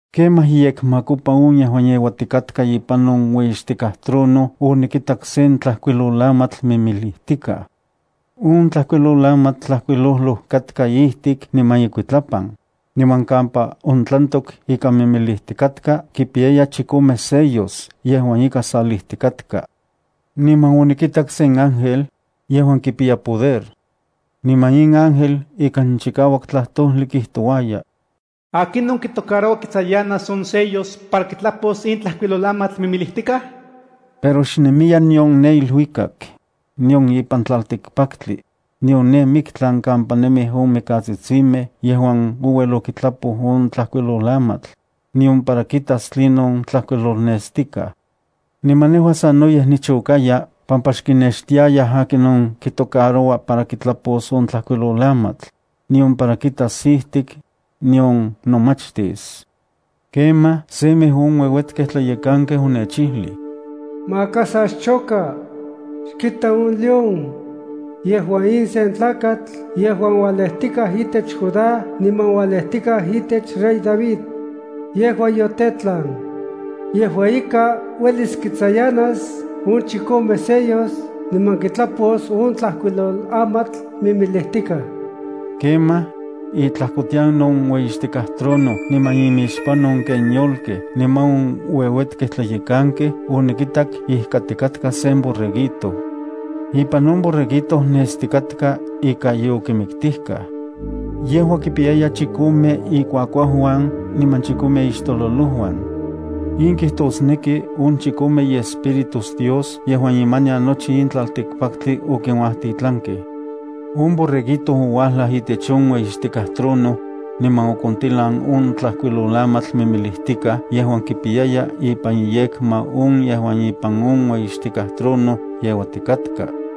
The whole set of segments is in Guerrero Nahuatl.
Kemaj iyekmakopa on yejuan yeuatikatka ipan on ueyixtikaj trono onikitak sen tlajkuilolamatl mimilijtikaj. On tlajkuilolamatl tlajkuilojloj katka ijtik niman ikuitlapan, niman kampa ontlantok ika mimilijtikatka kipiya chikome sellos yejuan ika salijtikatka. Niman onikitak sen ángel, yejuan kipiya poder. Niman in ángel ikan chikauak tlajtojli kijtouaya: “¿Akinon kitocaroua kitsayanas on sellos para kitlapos in tlajkuilolamatl mimilijtikaj?” Pero xnemiya nion ne iluikak, nion ipan tlaltikpaktli, nion ne miktlan kampa nemij on mikatsitsimej yejuan ouel okitlapoj on tlajkuilolamatl, nion para kitas tlinon tlajkuilolnestikaj. Niman nejua sanoyej nichokaya pampa xkinextiayaj akinon kitocaroua para kitlapos on tlajkuilolamatl, nion para kitas ijtik, nion nomachtis. Kemaj, semej on ueuetkej tlayekankej onechijlij: “Maka sa xchoka. Xkita on León. Yejua in sen tlakatl yejuan ualejtikaj itech Judá niman ualejtikaj itech rey David. Yejua yotetlan. Yejua ika, uelis kitsayanas on chikome sellos niman kitlapos on tlajkuilolamatl mimilijtikaj.” Kemaj, itlajkotian on ueyixtikaj trono niman imixpan on ken yolkej niman on ueuetkej tlayekankej onikitak ijkatikatka sen Borreguito. Ipan on Borreguito nestikatka ika yokimiktijkaj. Yejua kipiyaya chikome ikuakuauuan niman chikome ixtololojuan. In kijtosneki on chikome iEspíritus Dios yejuan imanian nochi in tlaltikpaktli okinuajtitlankej. On Borreguito ouajlaj itech on ueyixtikaj trono, niman okontilan on tlajkuilolamatl mimilijtikaj yejuan kipiyaya ipan iyekma on yejuan ipan on ueyixtikaj trono yeuatikatka.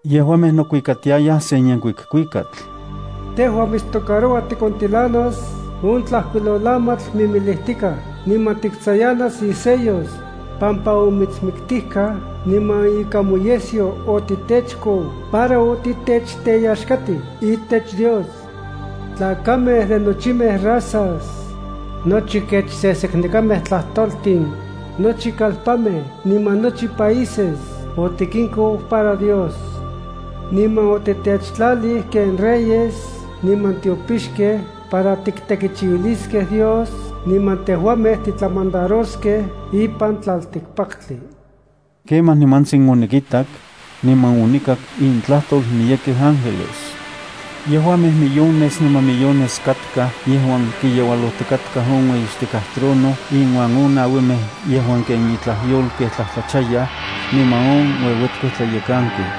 Yejuamej nokuikatiayaj sen yenkuik kuikatl: “Tejua mitstocaroua tikontilanas on tlajkuilolamatl mimilijtikaj, niman tiktsayanas isellos, pampa omitsmiktijkaj, niman ikan moyesyo otitechkou para otitechteyaxkatij itech Dios. Tlakamej de nochimej razas, nochi kech seseknekamej tlajtoltin, nochi kalpanmej niman nochi países otikinkou para Dios. Niman otitechtlalij ken reyes niman tiopixkej para tiktekichiuiliskej Dios, niman tejuamej titlamandaroskej ipan tlaltikpaktli.” Kemaj nimantsin onikitak, niman onikak intlajtol miyekej ángeles. Yejuamej millones niman millones katkaj yejuan kiyeualojtikatkaj on ueyixtikaj trono inuan on nauimej yejuan ken itlaj yolkej tlajtlachayaj, niman on ueuetkej tlayekankej.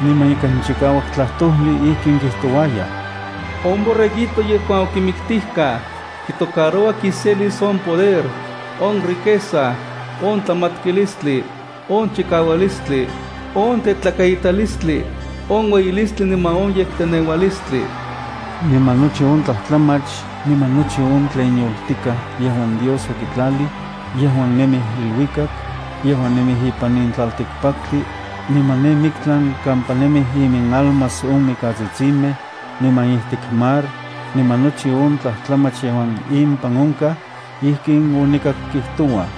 Niman ikan chikauak tlajtojli ijkin kijtouayaj: ¡“On Borreguito yejuan okimiktijkaj, kitocaroua kiselis on poder, on riqueza, on tlamatkilistli, on chikaualistli, on tetlakaitalistli, on ueyilistli niman on yekteneualistli!” Niman nochi on tlajtlamach niman nochi on tlen yoltikaj yejuan Dios okitlalij, yejuan nemij iluikak, yejuan nemij ipan in tlaltikpaktli, niman ne miktlan kampa nemij iminalmas on mikatsitsimej, niman ijtik mar, niman nochi on tlajtlamach yejuan impan onkaj, ijkin onikak kijtouaj: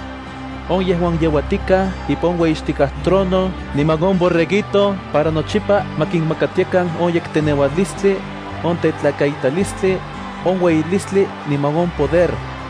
“On yejuan yeuatikaj ipan on ueyixtikaj trono niman on Borreguito, para nochipa ma kinmakatiakan on yekteneualistli, on tetlakaitalistli, on ueyilistli niman on poder.